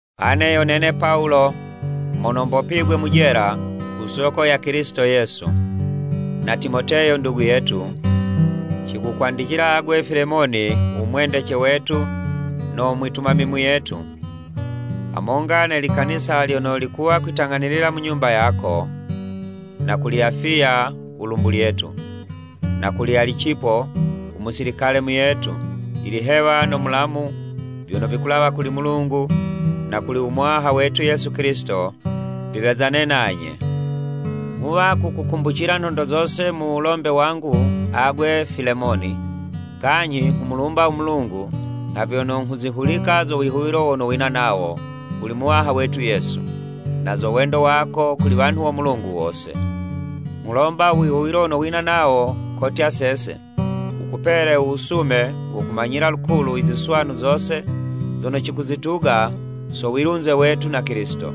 Ane yo nene Pawulo mono mbopigwe mu jela ku soko ya Kilisito Yesu, na Timoteyo ndugu yetu, cikukwandicila agwe Filemoni u mwendece wetu no mwitumami muyetu, hamonga ne likanisa lyono likuwa kwitang'anilila mu nyumba yako, na kuli Afiya u lumbu lyetu, na kuli Alicipo u musilikale muyetu. Ilihewa no mulamu vyono vikulawa kuli Mulungu na kuli u Muwaha wetu Yesu Kilisito, viwezane nanye. Nghuwa kukukumbucila nhondo zose mu wulombe wangu agwe Filemoni, kanyhi nghumulumba u Mulungu, nha vyono nghuzihulika zo wihuwilo wono wina nawo kuli Muwaha wetu Yesu, na zo wendo wako kuli wanhu wo Mulungu wose. Nghulomba u wihuwilo wono wina nawo kotya sese, wukupele u wusume wo kumanyila lukulu i ziswanu zose zono cikuzituga so wilunze wetu na Kilisito.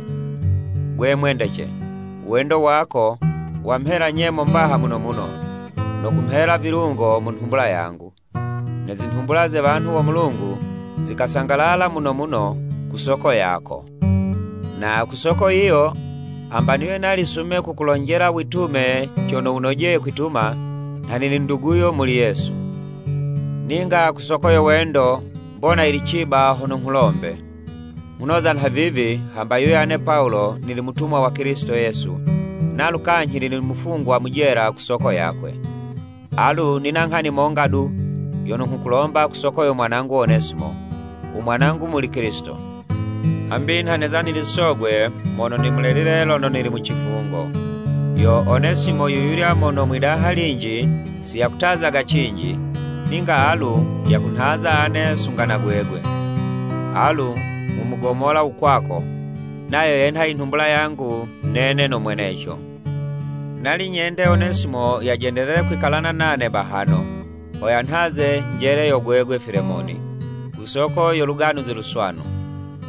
Gwe mwendece, u wendo wako wamhela nyemo mbaha muno muno, no kumhela vilungo mu nhumbula yangu! Ne zinhumbula ze wanhu wo Mulungu zikasangalala muno muno ku soko yako. Na ku soko yiyo, hamba niwe nali sume kukulonjela witume cono wunojeye kwituma, nha nili nduguyo muli Yesu. Ninga ku soko yo wendo, mbona yili ciba hono nghulombe. Nghunoza nha vivi, hamba yiwe ane Pawulo nili mutumwa wa Kilisito Yesu, nalu kanyhi nili mufungwa mu jela ku soko yakwe. Alu nina nghani monga du yono nghukulomba ku soko yo mwanangu Onesimo, u mwanangu muli Kilisito, hambi nha neza nili sogwe mono nimuleleye lono nili mu cifungo. Yo Onesimo yuyulya mono mwidaha linji si yakutazaga cinji, ninga alu yakunhaza ane sunga na gwegwe. Alu nghumugomola u kwako, nayo yenha i nhumbula yangu nene no mweneco. Nali nyende Onesimo yajendelele kwikalana nane bahano, ho yanhaze njele yo gwegwe Filemoni, ku soko yo Luganuzi Luswanu,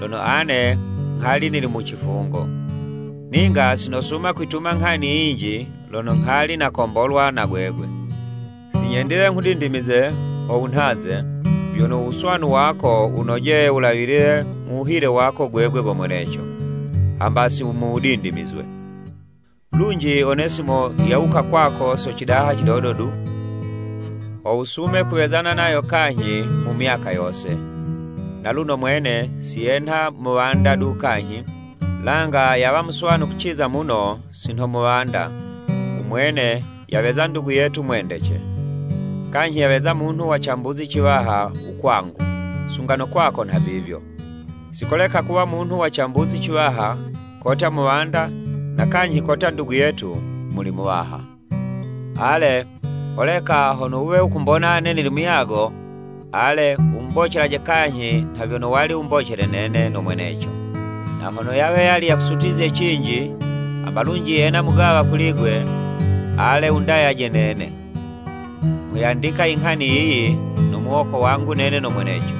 lono ane nghali nili mu cifungo. Ninga si nosuma kwituma nghani yinji lono nghali nakombolwa na gwegwe. Si nyendile nghudindimize ho wunhaze, vyono u wuswanu wako wunojeye wulawilile mu wuhile wako gwegwe go mweneco, hamba si mu wudindimizwe. Lunji Onesimo yawuka kwako so cidaha cidodo du, ho wusume kuwezana nayo kanyhi mu myaka yose. Naluno mwene, si yenha muwanda du kanyhi, langa yawa muswanu kuciza muno si nho muwanda, u mwene yaweza ndugu yetu mwendece. Kanyhi yaweza munhu wa cambuzi ciwaha u kwangu, sunga no kwako nhavivyo, si koleka kuwa munhu wa cambuzi ciwaha kotya muwanda na kanyhi kotya ndugu yetu muli Muwaha. Ale, holeka hono wuwe wukumbona ane nili muyago, ale, wumubocelaje kanyhi nha vyono wali wumbocele nene no mweneco. Na hono yawe yali yakusutizye cinji, hamba lunji yena mugawa kuli 'gwe, ale, wundayaje nene. Nghuyandika i nghani yiyi no muwoko wangu nene no mweneco.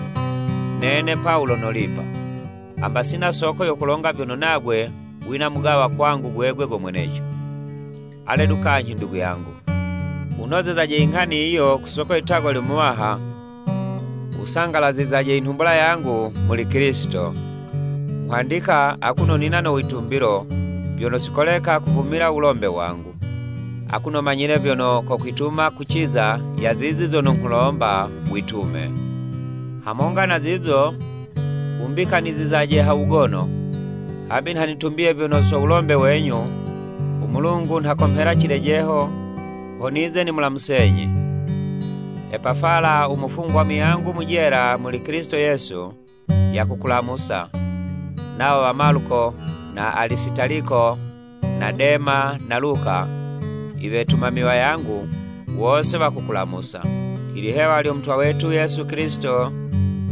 Nene Pawulo nolipa! (Hamba sina soko yo kulonga vyono nagwe wina mugawa kwangu gwegwe go mweneco.) Ale du kanyhi ndugu yangu, wunozezaje i nghani yiyo ku soko ye litagwa lyo Muwaha, wusangalazizaje i nhumbula yangu muli Kilisito. Nghwandika, akuno nina no witumbilo, vyono si koleka kuvumila u wulombe wangu. Akuno manyile, vyono kokwituma kuciza ya zizi zono nghukulomba witume. Hamonga na zizo, wumbikanizizaje ha wugono, hambi nha nitumbiye vyono so wulombe wenyu, u Mulungu nha komhela cilejeho, ho nize nimulamusenyi Epafala u mufungwa muyangu mu jela muli Kilisito Yesu, yakukulamusa. Nawo wa Maluko na Alisitaliko na Dema na Luka, i wetumami wayangu, wose wakukulamusa. Ilihewa lyo Mutwa wetu Yesu Kilisito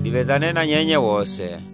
liwezane na nyenye wose.